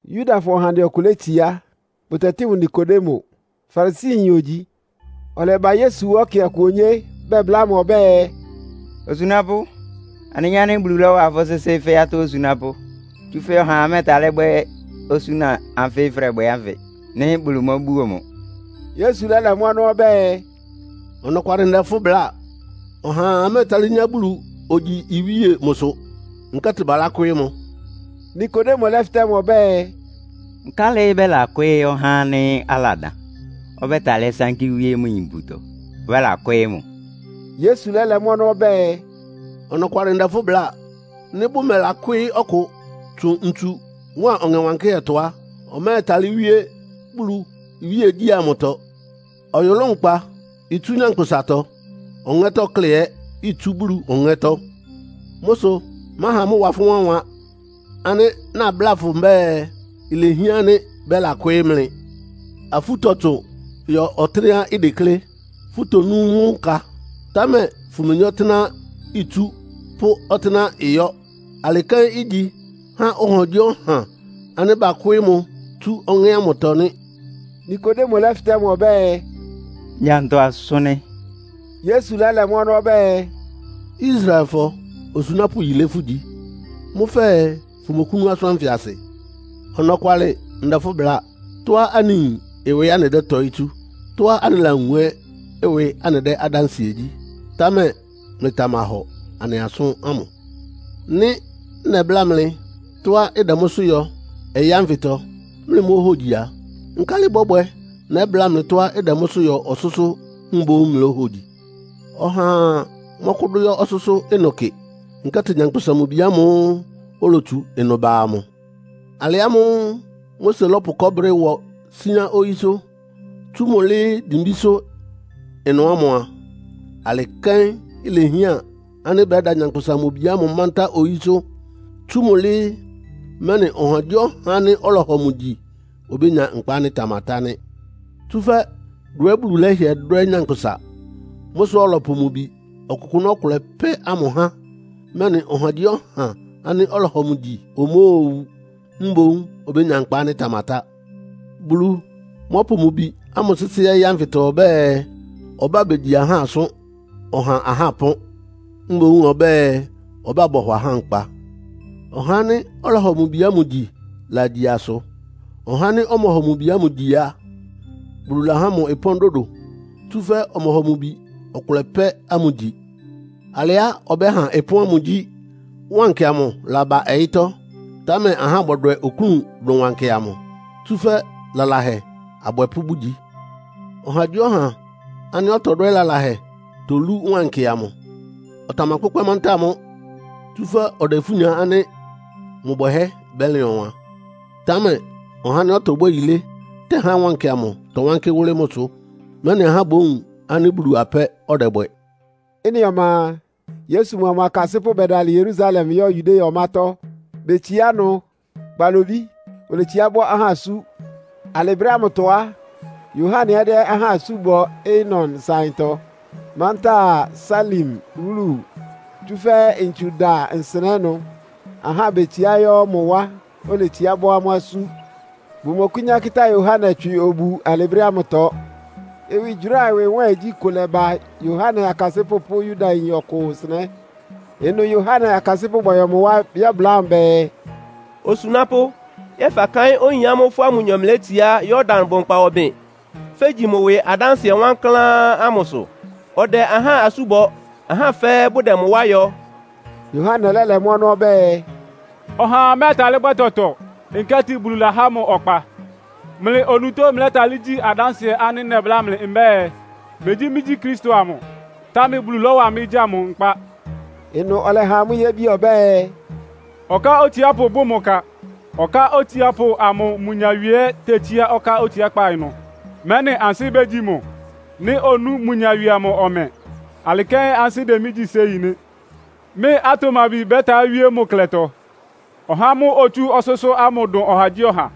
Yudafɔ ɔhandɛ ɔkʋ létsiá, bʋtɛtɩ́ mʋ Nikodemo. Farisiyin ogyi. Ɔlɛba Yesu wá ɛkɛ ɔkʋ onyé bɛbláa mʋ ɔbɛ́ɛ, “Osunápʋ́, anɩyin ánɩ́ Bulu lɔ́wa fʋ́ sɩ́sɩ́ fɛ́ atɔ́ osunápʋ́. Tsúfɛ́ ɔhaa mɛ́ɛtalɩ́ bwɛ́ osúna anfɩ fʋ́dɛbwɛ ánfɩ, nɩ́ Bulu móbúo mʋ.” Yesu lɛ́lɛ mʋ́ ɔnɔ́ ɔbɛ́ɛ, “Ɔnɔkwalɩ ndɛ fʋ́ bláa, ɔhaa mɛ́ɛtalɩ́ nyá Bulu ogyi iwíe mʋsʋ, nkɛ́tɩ balákwɩ́ɩ́ mʋ.” Nikodemo lɛ́fɩtɛ́ mʋ ɔbɛ́ɛ, “Nkálɩ́ bɛ́lakwɩ́ɩ́ ɔhá ánɩ́ aladan? Ɔbɛ́talɩ́ sánkí wíé mʋ yin iputɔ, ɔbɛ́lakwɩ́ɩ́ mʋ?” Yesu lɛ́lɛ mʋ́ ɔnɔ́ ɔbɛ́ɛ, “Ɔnɔkwalɩ ndɛ fʋ́ bláa. Nɩ́ bʋmɛlakwɩ́ɩ́ ɔkʋ tsʋn ntsu mʋ́a Ɔŋɛ Wankɩ́hɛ́tɔ á, ɔmɛ́ɛtalɩ́ wíé Bulu iwíegyí ámʋtɔ. Ɔyʋlʋ́ʋ nkpa itsú nyankpʋsatɔ, ɔŋɛ́tɔ́ klɛ́ ɛ́ itsú Bulu Ɔŋɛ́tɔ́. Mʋ́ sʋ máha mʋ́ ɩwa fʋ́ wánwan ánɩ́ nabláa fʋ mbɛ́ɛ, ilehián ánɩ́ bɛ́lakwɩ́ɩ́ mlɩ. Afú tɔtsʋn yɔ ɔtɩ́nɛ́á ideklé. Fʋtonú mʋ́ nka, támɛ fʋmeyín ɔtɩ́nɛ́á itsú pʋ́ ɔtɩ́nɛ́á ɩyɔ́. Alɩ kɛ́n igyi há ɔhagyíɔha ánɩ́ bakwɩ́ɩ́ mʋ tsú Ɔŋɛ́ ámʋtɔ nɩ́.” Nikodemo lɛ́fɩtɛ́ mʋ ɔbɛ́ɛ, “Ngya ntɔ asʋ́n nɩ́?” Yesu lɛ́lɛ mʋ́ ɔnɔ́ ɔbɛ́ɛ, “Israelfɔ osunápʋ́ yilé fʋ́gyi, mʋ́ fɛɛ fʋmɔkʋ́nú asʋ́n ánfɩ asɩ? Ɔnɔkwalɩ ndɛ fʋ́ bláa. Tɔ́á anɩyin ɩwɩ anɩdɛ́tɔɩ́ tsú, tɔ́á anɩlawun ɛ́ ɩwɩ anɩdɛ́ adánsɩɛ gyí, támɛ mlɩtamahɔ anɩ asʋ́n ámʋ. Nɩ́ nɛbláa mlɩ tɔ́á ɩdɛ mʋ́sʋ́ yɔ ɔyɩ́ ánfɩtɔ, mlɩmóhogyi a, nkálɩ ɩbɔ́bwɛ nɛbláa mlɩ tɔ́á ɩdɛ mʋ́sʋ́ yɔ ɔsʋ́sʋ́ mboún mlóhogyi? Ɔhaa mɔ́kʋ́dʋ́ yɔ́ ɔsʋ́sʋ́ ɩnʋ kɩ, nkɛ́tɩ Nyankpʋsa-Mʋ-Bi ámʋ́ʋ́ olotsu ɩnʋ ba amʋ. “Alɩ ámʋ́ʋ́ Mose lɔ́pʋ kɔɔ́brɩ ɩwɔ síán oyísʋ́, tsú mʋ́ lɩ́ɩ́ dimbísʋ́ ɩnʋ ámʋ a, alɩ kɛ́n ilehián ánɩ́ bɛ́da Nyankpʋsa-Mʋ-Bi ámʋ mántá oyísʋ́, tsú mʋ́ lɩ́ɩ́, mɛ́nɩ ɔhagyíɔha ánɩ́ ɔlɔhɔ mʋ gyi obénya nkpa ánɩ́ ɩtamatá nɩ́. Tsúfɛ́ dwɛ́ Bulu lɛ́hɩɛ dwɛ́ anyánkpʋ́sa. Mʋ́ sʋ ɔlɔpʋ mʋ Bi ɔkʋkʋ́nʋ́ ɔkʋlɛ pɛ́ ámʋ há, mɛ́nɩ ɔhagyíɔha ánɩ́ ɔlɔhɔ mʋ gyi omóowu, mboún obénya nkpa ánɩ́ ɩtamatá. Bulu mɔ́pʋ mʋ Bi ámʋ sɩ́sɩ́ ɔyɩ́ ánfɩtɔ ɔbɛ́ɛ, ɔbá begyi ahá asʋ́n, ɔha ahá ɩpɔ́n, mboún ɔbɛ́ɛ, ɔbá bɔhɔ ahá nkpa. “Ɔhá ánɩ́ ɔlɔhɔ mʋ Bi ámʋ gyi lagyi asʋ. Ɔhá ánɩ́ ɔmɔhɔ mʋ Bi ámʋ gyi a, Bulu lahá mʋ ɩpɔ́n dodo, tsúfɛ́ ɔmɔhɔ mʋ Bi ɔkʋlɛ pɛ́ ámʋ gyi. Alɩá ɔbɛ́ha ɩpɔ́n ámʋ gyí, wankɩ amʋ laba ɔyɩ́tɔ́, támɛ ahá bɔdwɛ oklún dʋn wankɩ amʋ, tsúfɛ́ lalahɛ abwɛpʋ́ bʋgyi. Ɔhagyíɔha ánɩ́ ɔtɔbwɛ́ lalahɛ tolú wankɩ amʋ. Ɔtamakpʋ́kpɛ́ mantáa mʋ́, tsúfɛ́ ɔdɛ ifú nya ánɩ́ mʋ bwɛhɛ́ bɛ́lɩn ɔwan. Támɛ ɔhá ánɩ́ ɔtɔbwɛ́ yilé tɛhá wankɩ amʋ tɔwánkɩ́ wʋ́lɩ́ mʋsʋ, mɛ́nɩ ahá bówun ánɩ́ Bulu apɛ́ ɔdɛbwɛ.” Ɩ́nɩ ɔma a, Yesu mʋa mʋ akasɩ́pʋ́ bɛdalɩ Yerusalem yɔ́ Yudea ɔmátɔ́. Betsiá ɩnʋ kpalobí, oletsiá bɔ ahá asú. Alɩ brɛ́ ámʋtɔ á, Yohane ɛ́ dɛ́ ahá asú bɔ Aenon nsáɩntɔ, mantáa Salim wúlu. Tsúfɛ́ ntsu dada nsɩnɛ́ ɩnʋ. Ahá betsiá yɔ́ mʋ wá, oletsiá bɔ́ amʋ́ asú. (Bʋmɔkʋ́nyá kɩ́tá Yohane tswɩ obu alɩ brɛ́ ámʋtɔ.) Ɩwɩgyʋráa ɩwɩ nwɛ́ɛngyí kʋ lɛba Yohane akasɩ́pʋ́ pʋ́ Yudayin ɔkʋ nsɩnɛ́. Ɩnʋ Yohane akasɩ́pʋ́ bɔyɔ mʋ wá yɛ́bláa mʋ bɛɛ, “Osunápʋ́, yɛ́ɛ fakáɩ́n oyin ámʋ́ʋ́ fʋ́a mʋnyɔ mlɩlétsiá Yordan bʋnkpa ɔbɩn, fegyi mʋ ɩwɩ adánsɩɛ wankláán ámʋsʋ? Ɔdɛ ahá asú bɔ, ahá fɛ́ɛ́ bʋdɛ mʋ wá yɔ.” Yohane lɛ́lɛ mʋ́ ɔnɔ́ ɔbɛ́ɛ, “Ɔhaa mɛ́ɛtalɩ́ bwɛ́ tɔtɔ, nkɛ́tɩ Bulu lahá mʋ ɔkpa. Mlɩ onutó mlɛ́talɩ́ gyi mɩ adánsɩɛ ánɩ́ nɛbláa mlɩ mbɛ́ɛ, ‘Megyí mɩ́gyí Kristo amʋ, támɛ Bulu lɔ́wa mɩ́ gya mʋ nkpá.’” Ɩnʋ ɔlɛha amʋ́ yébi ɔbɛ́ɛ, “Ɔká otsiápʋ bʋ́ mʋ ka. Ɔká otsiápʋ amʋ mʋ nyawie ɛ́ tetsíá ɔká otsiákpá ɩnʋ, mɛ́nɩ ansɩ́ bégyi mʋ nɩ́ onú mʋ nyawie amʋ ɔmɛ. Alɩ kɛ́n ansɩ́ dɛ mɩ́ gyí séi nɩ́. Mɩ́ atʋmabi bɛ́ta wíé mʋ klɛtɔ.” Ɔhá ámʋ́ʋ́ otsú ɔsʋ́sʋ́ ámʋ dʋn ɔhagyíɔha.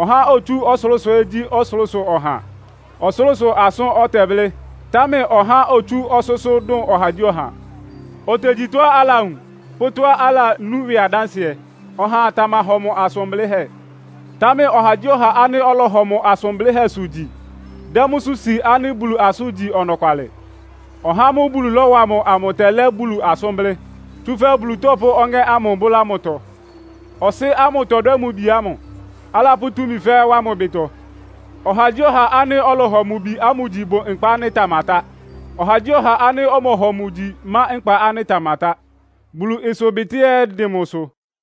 Ɔhá ánɩ́ otsú ɔsʋlʋ́sʋ ɛ́ gyí ɔsʋlʋ́sʋ ɔha. Ɔsʋlʋ́sʋ asʋ́n ɔtɛblɩ́, támɛ ɔhá ánɩ́ otsú ɔsʋ́sʋ́ dʋn ɔhagyíɔha. Otegyi tɔ́á alawun pʋ́ tɔ́á alanú ɩwɩ adánsɩɛ, ɔhaa tamahɔ mʋ asʋn blɩ́hɛ́. Támɛ ɔhagyíɔha ánɩ́ ɔlɔhɔ mʋ asʋn blɩ́hɛ́sʋ gyi dɛ́ mʋ́sʋ́ si ánɩ́ Bulu asʋ́n igyi ɔnɔkwalɩ. Ɔhá ámʋ́ʋ́ Bulu lɔ́wa ámʋ tɛlɛ́ Bulu asʋ́n blɩ́, tsúfɛ́ Bulu tɔpʋ́ Ɔŋɛ́ ámʋ bʋ́lá mʋtɔ. Ɔsɩ́ ámʋ tɔdwɛ́ mʋ Bi ámʋ, alapʋ́ túmi fɛ́ɛ́ wá mʋ ɩbɩtɔ. Ɔhagyíɔha ánɩ́ ɔlɔhɔ mʋ Bi ámʋ gyi bʋ nkpa ánɩ́ ɩtamatá. Ɔhagyíɔha ánɩ́ ɔmɔhɔ mʋ gyi má nkpa ánɩ́ ɩtamatá. Bulu ɩsʋbɩtɩ́ ɛ́ ɩdɩn mʋsʋ.